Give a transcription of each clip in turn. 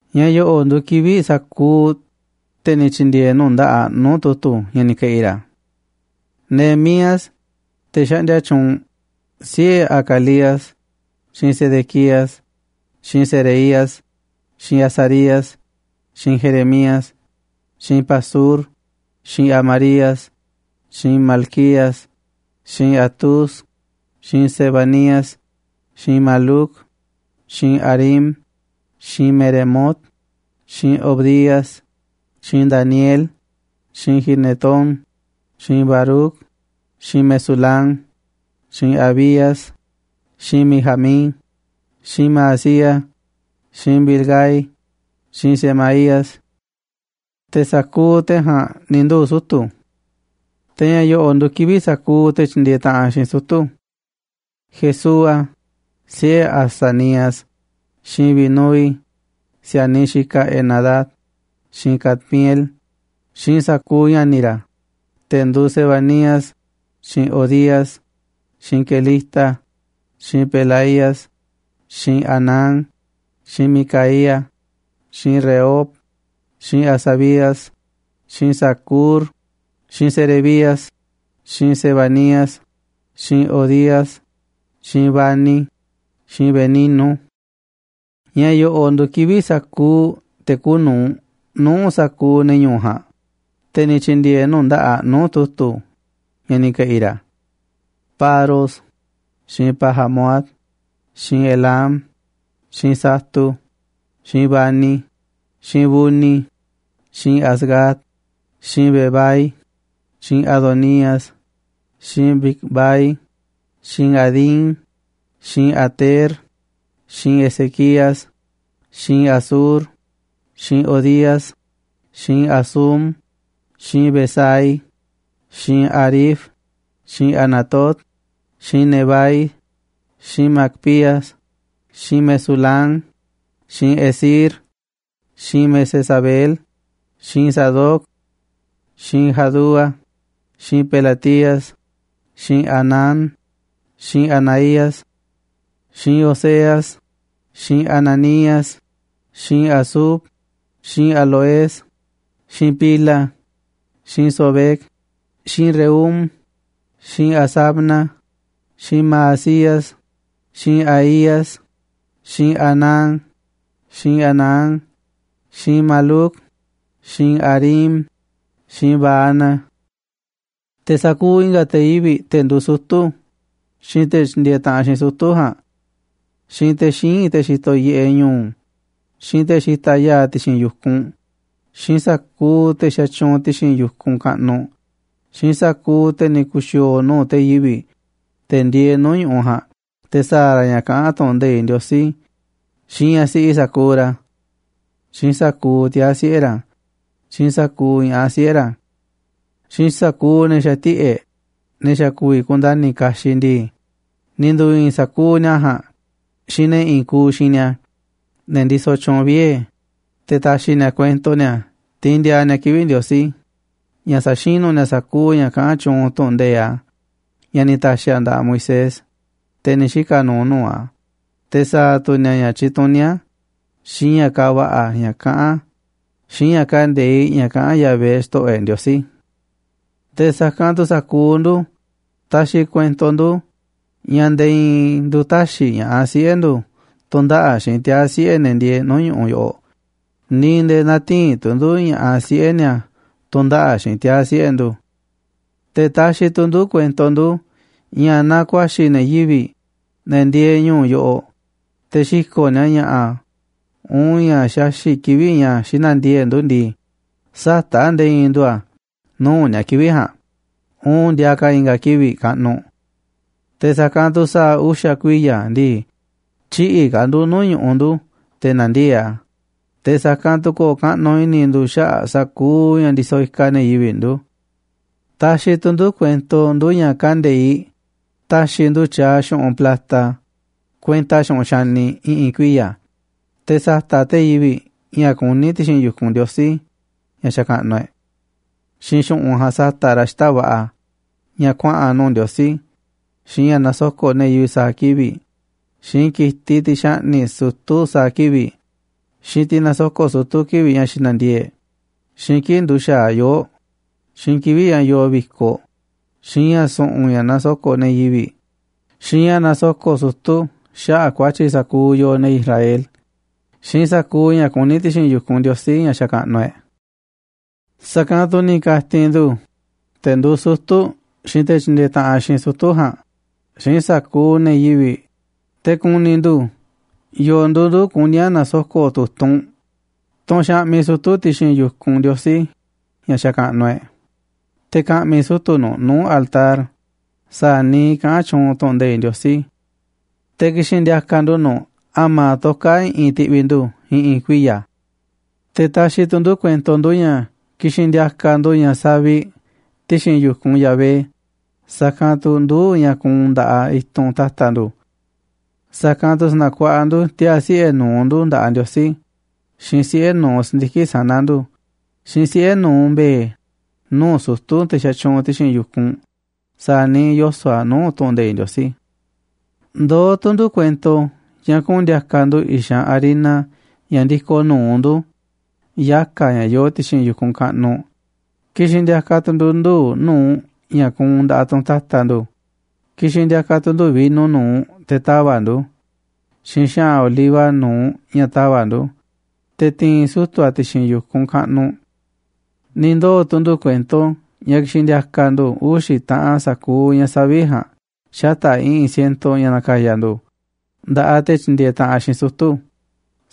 Ña̱ yo̱ꞌo̱ꞌ nduuꞌ kivi̱ꞌ sa̱kuuꞌ te̱ ni̱ tyi̱ndi̱e̱e̱ nuu̱ꞌ nda̱ꞌaꞌ nuu̱ꞌ tu̱tu̱ ña̱ ni̱ ke̱ꞌi̱ ra̱: Nehemías, te̱ xaꞌndia tyuunꞌ, siꞌe̱ Hacalías, xiinꞌ Sedequías, xiinꞌ Seraías, xiinꞌ Azarías, xiinꞌ Jeremías, xiinꞌ Pasur, xiinꞌ Amarías, xiinꞌ Malquías, xiinꞌ Hatús, xiinꞌ Sebanías, xiinꞌ Maluc, xiinꞌ Harim, xiinꞌ Meremot, xiinꞌ Obadías, xiinꞌ Daniel, xiinꞌ Ginetón, xiinꞌ Baruc, xiinꞌ Mesulam, xiinꞌ Abías, xiinꞌ Mijamín, xiinꞌ Maazías, xiinꞌ Bilgai, xiinꞌ Semaías. Te̱ sa̱kuuꞌ te̱ ja̱a̱nꞌ ni̱ nduu̱ sutu̱. Te̱ ña̱ yo̱ꞌo̱ꞌ nduuꞌ kivi̱ꞌ sa̱kuuꞌ te̱ tyindieeꞌ taꞌanꞌ xiinꞌ sutu̱: Jesúa, siꞌe̱ Azanías, xiinꞌ Binúi, si̱a̱niꞌ xikaꞌ Henadad, xiinꞌ Cadmiel, xiinꞌ sa̱kuuꞌ ña̱ni̱ ra̱, te̱ nduuꞌ Sebanías, xiinꞌ Hodías, xiinꞌ Kelita, xiinꞌ Pelaías, xiinꞌ Hanán, xiinꞌ Micaía, xiinꞌ Rehob, xiinꞌ Hasabías, xiinꞌ Zacur, xiinꞌ Serebías, xiinꞌ Sebanías, xiinꞌ Hodías, xiinꞌ Bani, xiinꞌ Beninu. Ña̱ yo̱ꞌo̱ꞌ nduuꞌ kivi̱ꞌ sa̱kuuꞌ te̱ kuuꞌ nu̱uꞌ nuu̱ꞌ sa̱kuuꞌ ne̱ ñu̱u̱ ja̱a̱nꞌ, te̱ ni̱ tyi̱ndi̱e̱e̱ nuu̱ꞌ nda̱ꞌaꞌ nuu̱ꞌ tu̱tu̱ ña̱ ni̱ ke̱ꞌi̱ ra̱: Paros, xiinꞌ Pahat-moab, xiinꞌ Elam, xiinꞌ Zatu, xiinꞌ Bani, xiinꞌ Buni, xiinꞌ Azgad, xiinꞌ Bebai, xiinꞌ Adonías, xiinꞌ Bigvai, xiinꞌ Adín, xiinꞌ Ater, xiinꞌ Ezequías, xiinꞌ Azur, xiinꞌ Hodías, xiinꞌ Hasum, xiinꞌ Bezai, xiinꞌ Harif, xiinꞌ Anatot, xiinꞌ Nebai, xiinꞌ Magpías, xiinꞌ Mesulam, xiinꞌ Hezir, xiinꞌ Mesezabeel, xiinꞌ Sadoc, xiinꞌ Jadúa, xiinꞌ Pelatías, xiinꞌ Hanán, xiinꞌ Anaías, xiinꞌ Oseas, xiinꞌ Hananías, xiinꞌ Hasub, xiinꞌ Halohes, xiinꞌ Pilha, xiinꞌ Sobec, xiinꞌ Rehum, xiinꞌ Hasabna, xiinꞌ Maasías, xiinꞌ Ahías, xiinꞌ Hanán, xiinꞌ Anán, xiinꞌ Maluc, xiinꞌ Harim, xiinꞌ Baana. Te̱ sa̱kuuꞌ i̱nga̱ te̱ yivi̱ꞌ, te̱ nduu sutu̱, xiinꞌ te̱ tyindieeꞌ taꞌanꞌ xiinꞌ sutu̱ ja̱a̱nꞌ, xiinꞌ te̱ xíinꞌ, te̱ xitoꞌ yiꞌeꞌ ñu̱u̱, xiinꞌ te̱ xitaꞌ ya̱a̱ ti̱xi̱n yu̱kunꞌ, xiinꞌ sa̱kuuꞌ te̱ xatyuunꞌ ti̱xi̱n yu̱kunꞌ kaꞌnuꞌ, xiinꞌ sa̱kuuꞌ te̱ ni̱ ku̱xi̱o̱o̱ nuu̱ꞌ te̱ yivi̱ꞌ, te̱ ndieeꞌ nuu̱ꞌ ñu̱ꞌuꞌ ja̱a̱nꞌ te̱ sa̱a̱ ra̱ ña̱ kaꞌán tu̱ꞌu̱n nde̱iꞌ Ndiosí, xiinꞌ ñaꞌ siꞌi sa̱kuuꞌ ra̱, xiinꞌ sa̱kuuꞌ tiaa̱ siꞌe̱ ra̱, xiinꞌ sa̱kuuꞌ ña̱ꞌaꞌ siꞌe̱ ra̱, xiinꞌ sa̱kuuꞌ ne̱ xa̱ tiꞌe̱ꞌ, ne̱ xa̱ ku̱vi̱ kundani̱ kaxiꞌ ndii, ni̱ ndu̱i̱i̱n sa̱kuu ni̱a̱ ja̱a̱nꞌ xiinꞌ ne̱ i̱i̱n kuuꞌ xiinꞌ ni̱a̱, ne̱ ndisoꞌ tyuunꞌ vie̱, te̱ ta̱xi̱ ni̱a̱ kuento ni̱a̱ tiinꞌ ndiaa ni̱a̱ kivi̱ꞌ Ndiosí ña̱ sa̱xinu̱ ni̱a̱ sa̱kuuꞌ ña̱ kaꞌán tyuunꞌ tu̱ꞌu̱n nde̱iꞌ a̱ ña̱ ni̱ ta̱xi̱ a̱ nda̱ꞌaꞌ Moisés, te̱ ni̱ xika̱ nuuꞌ nuu̱ꞌ a̱, te̱ sa̱a̱ tu̱ ni̱a̱ ña̱ tyituní a̱, xiinꞌ ña̱ kaaꞌ va̱ꞌa̱ ña̱ kaꞌán a̱, xiinꞌ ña̱ kande̱iꞌ ña̱ kaꞌán Yahvé, Xto̱ꞌo̱ e̱ꞌ Ndiosí. “Te̱ sa̱kanꞌ tu̱ sa̱kuuꞌ ndu̱ taxiꞌ kuento ndu̱ ña̱ nde̱e̱ i̱i̱n ndu̱ tä̱xi̱ ña̱ꞌaꞌ siꞌe̱ ndu̱ tu̱ndaꞌa̱ꞌ xiinꞌ tiaa̱ siꞌe̱ ne̱ ndieeꞌ nuu̱ꞌ ñu̱ꞌuꞌ yoꞌoꞌ, ni̱ nde̱e̱ nä̱ti̱i̱n tu̱ ndu̱ ña̱ꞌaꞌ siꞌe̱ ni̱a̱ tu̱ndaꞌa̱ꞌ xiinꞌ tiaa̱ siꞌe̱ ndu̱. Te̱ taxiꞌ tu̱ ndu̱ kuento ndu̱ ña̱ naaꞌ ku̱a̱xi̱ ne̱ yivi̱ꞌ, ne̱ ndieeꞌ ñu̱u̱ yoꞌoꞌ, te̱ xi̱ko̱ꞌ ni̱a̱ ña̱ꞌa̱, uun ña̱ xaxi̱ꞌ kivi̱ꞌ ña̱ xinandiee̱ꞌ ndu̱ ndii, sä̱ta̱ꞌ nde̱e̱ i̱i̱n ndu̱ a̱ nuu̱ꞌ ni̱a̱ kivi̱ꞌ ja̱a̱nꞌ, uun ndiaa ka̱ i̱nga̱ kivi̱ꞌ kaꞌnuꞌ. Te̱ sa̱kanꞌ tu̱ sa̱a̱ uxa̱ kuiya̱ ndii, tyï̱ꞌi̱ ka̱ ndu̱ nuu̱ꞌ ñu̱ꞌuꞌ ndu̱ te̱ na̱ndiee̱ꞌ a̱, te̱ sa̱kanꞌ tu̱ ko̱o̱ kaꞌnuꞌ i̱ni̱ ndu̱ xaꞌa̱ꞌ sa̱kuuꞌ ña̱ ndisoꞌ ikaꞌ ne̱ yivi̱ꞌ ndu̱. Taxiꞌ tu̱ ndu̱ kuento ndu̱ ña̱ kande̱iꞌ ta̱xi̱ ndu̱ tyaaꞌ xu̱ꞌunꞌ plata kuenta xu̱ꞌunꞌ xaniꞌ i̱ꞌi̱n kuiya̱, te̱ sa̱ta̱ꞌ te̱ yivi̱ꞌ ña̱ kuní ti̱xi̱n yu̱kunꞌ Ndiosí, ña̱ xakaꞌnuꞌ e̱ꞌ. Xiinꞌ xu̱ꞌunꞌ ja̱a̱nꞌ sa̱ta̱ꞌ ra̱ xita̱ꞌ va̱ꞌa̱ ña̱ kuaꞌa̱n nuu̱ꞌ Ndiosí, xiinꞌ ña̱ nasoko̱ꞌ ne̱ yivi̱ꞌ sa̱a̱ kivi̱ꞌ, xiinꞌ ki̱tiꞌ, tiꞌ xaꞌni̱ꞌ sutu̱ sa̱a̱ kivi̱ꞌ, xiinꞌ tiꞌ nasoko̱ꞌ sutu̱ kivi̱ꞌ ña̱ xinandiee̱ꞌ e̱ꞌ, xiinꞌ kii̱ꞌ nduxa̱aꞌ yoo̱ꞌ, xiinꞌ kivi̱ꞌ ña̱ yoo vi̱koꞌ, xiinꞌ ña̱ su̱ꞌu̱n ña̱ nasoko̱ꞌ ne̱ yivi̱ꞌ, xiinꞌ ña̱ nasoko̱ꞌ sutu̱ xaꞌa̱ꞌ ku̱a̱tyi̱ sa̱kuuꞌ yooꞌ, ne̱ Israel, xiinꞌ sa̱kuuꞌ ña̱ kuní ti̱xi̱n yu̱kunꞌ Ndiosí, ña̱ xakaꞌnuꞌ e̱ꞌ. ’Sa̱kanꞌ tu̱ ni̱ ka̱ti̱n ndu̱, te̱ nduuꞌ sutu̱ xiinꞌ te̱ tyindieeꞌ taꞌanꞌ xiinꞌ sutu̱ ja̱a̱nꞌ, xiinꞌ sa̱kuuꞌ ne̱ yivi̱ꞌ, te̱ ku̱ni̱ ndu̱ yo̱o̱ nduuꞌ ndu̱ kuní a̱ na̱soko̱ꞌ tu̱tunꞌ, tunꞌ xaꞌmiꞌ sutu̱ ti̱xi̱n yu̱kunꞌ Ndiosí, ña̱ xakaꞌnuꞌ e̱ꞌ, te̱ ka̱ꞌmi̱ sutu̱ nu̱ꞌ nuu̱ꞌ altar sa̱a̱ niiꞌ kaꞌán tyuunꞌ tu̱ꞌu̱n nde̱iꞌ Ndiosí. Te̱ ki̱xi̱n ndi̱a̱ka̱ ndu̱ nu̱ꞌ a̱ma̱ toká i̱ꞌi̱n ti̱ꞌvi̱ ndu̱ i̱ꞌi̱n kuiya̱. Te̱ taxiꞌ tu̱ ndu̱ kuento ndu̱ ña̱ ki̱xi̱n ndi̱a̱ka̱ ndu̱ ña̱ saviꞌ ti̱xi̱n yu̱kunꞌ Yahvé, sa̱kanꞌ tu̱ nduu̱ꞌ ña̱ kuunꞌ nda̱ꞌaꞌ i̱tunꞌ ta̱ta̱ ndu̱. Sa̱kanꞌ tu̱ sa̱na̱kuaꞌa ndu̱ tiaa̱ siꞌe̱ nu̱uꞌ ndu̱ nda̱ꞌaꞌ Ndiosí, xiinꞌ siꞌe̱ nu̱uꞌ si̱ndiki̱ꞌ sana̱ ndu̱, xiinꞌ siꞌe̱ nu̱uꞌ mbe̱e̱ nuu̱ꞌ sutu̱, te̱ xatyuunꞌ ti̱xi̱n yu̱kunꞌ, sa̱a̱ niiꞌ yoso̱ꞌ a̱ nuu̱ꞌ tu̱ꞌu̱n nde̱iꞌ Ndiosí. ’Ndoó tu̱ ndu̱ kuento ña̱ kuꞌu̱n ndi̱a̱ka̱ ndu̱ i̱xanꞌ harina ña̱ ndi̱ko̱ nu̱uꞌ ndu̱, yaka̱ ña̱ yoo ti̱xi̱n yu̱kunꞌ kaꞌnuꞌ, ki̱xi̱n ndi̱a̱ka̱ tu̱ ndu̱ nduu̱ꞌ nu̱uꞌ ña̱ kuunꞌ nda̱ꞌaꞌ tunꞌ ta̱ta̱ ndu̱, ki̱xi̱n ndi̱a̱ka̱ tu̱ ndu̱ vino nu̱uꞌ teꞌ ta̱va̱ꞌ ndu̱, xiinꞌ xa̱ꞌa̱n oliva nu̱uꞌ ña̱ ta̱va̱ꞌ ndu̱, te̱ ti̱i̱n sutu̱ a̱ ti̱xi̱n yu̱kunꞌ kaꞌnuꞌ. Ni̱ ndoo̱ tu̱ ndu̱ kuento ña̱ ki̱xi̱n ndi̱a̱ka̱ ndu̱ uxi̱ taꞌan sa̱kuuꞌ ña̱ saviꞌ ja̱a̱nꞌ xata̱ꞌ i̱ꞌi̱n siento ña̱ na̱ka̱ya̱ ndu̱ nda̱ꞌaꞌ te̱ tyindieeꞌ taꞌanꞌ xiinꞌ sutu̱,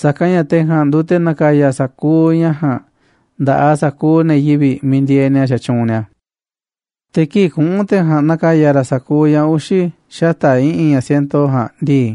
sa̱kanꞌ ña̱ te̱ ja̱a̱nꞌ nduuꞌ te̱ na̱ka̱ya̱ sa̱kuuꞌ ña̱ ja̱a̱nꞌ nda̱ꞌaꞌ sa̱kuuꞌ ne̱ yivi̱ꞌ miiꞌ ndieeꞌ ni̱a̱ xatyuunꞌ ni̱a̱. ’Te̱ kii̱ꞌ kuꞌu̱n te̱ ja̱a̱nꞌ na̱ka̱ya̱ ra̱ sa̱kuuꞌ ña̱ uxi̱ xata̱ꞌ i̱ꞌi̱n ña̱ siento ja̱a̱nꞌ ndii,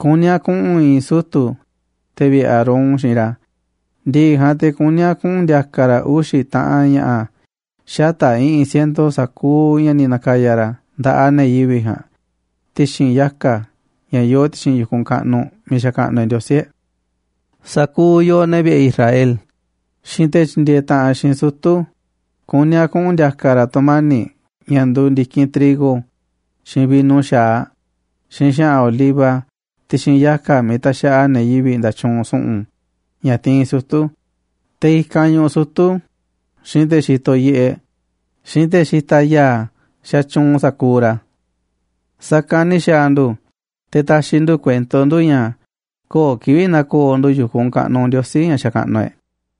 kuní a̱ kuꞌu̱n i̱i̱n sutu̱ te̱ vi̱ꞌe̱ Aarón xiinꞌ ra̱, ndi̱ꞌi̱ ja̱a̱nꞌ te̱ kuní a̱ kuꞌu̱n ndi̱a̱ka̱ ra̱ uxi̱ taꞌan ña̱ꞌa̱ xata̱ꞌ i̱ꞌi̱n siento sa̱kuuꞌ ña̱ ni̱ na̱ka̱ya̱ ra̱ nda̱ꞌaꞌ ne̱ yivi̱ꞌ ja̱a̱nꞌ ti̱xi̱n yaka̱ ña̱ yoo ti̱xi̱n yu̱kunꞌ kaꞌnuꞌ miiꞌ xakaꞌnuꞌ e̱ꞌ Ndiosí e̱ꞌ. Sa̱kuuꞌ yooꞌ, ne̱ vi̱ꞌe̱ Israel, xiinꞌ te̱ tyindieeꞌ taꞌanꞌ xiinꞌ sutu̱, kuní a̱ kuꞌu̱n ndi̱a̱ka̱ ra̱ tu̱mani̱ꞌ ña̱ nduuꞌ ndi̱kinꞌ trigo, xiinꞌ vino xa̱aꞌ, xiinꞌ xa̱ꞌa̱n oliva ti̱xi̱n yaka̱ miiꞌ taxaꞌa ne̱ yivi̱ꞌ nda̱tyuunꞌ su̱ꞌu̱n ña̱ tiinꞌ sutu̱, te̱ i̱kanꞌ ñuꞌuꞌ sutu̱, xiinꞌ te̱ xitoꞌ yiꞌeꞌ, xiinꞌ te̱ xitaꞌ ya̱a̱, xatyuunꞌ sa̱kuuꞌ ra̱. Sa̱kanꞌ ni̱ xa̱a̱ ndu̱ te̱ ta̱xi̱ ndu̱ kuento ndu̱ ña̱ köo̱ꞌ kivi̱ꞌ na̱ko̱o̱ ndu̱ yu̱kunꞌ kaꞌnuꞌ Ndiosí, ña̱ xakaꞌnuꞌ e̱ꞌ.”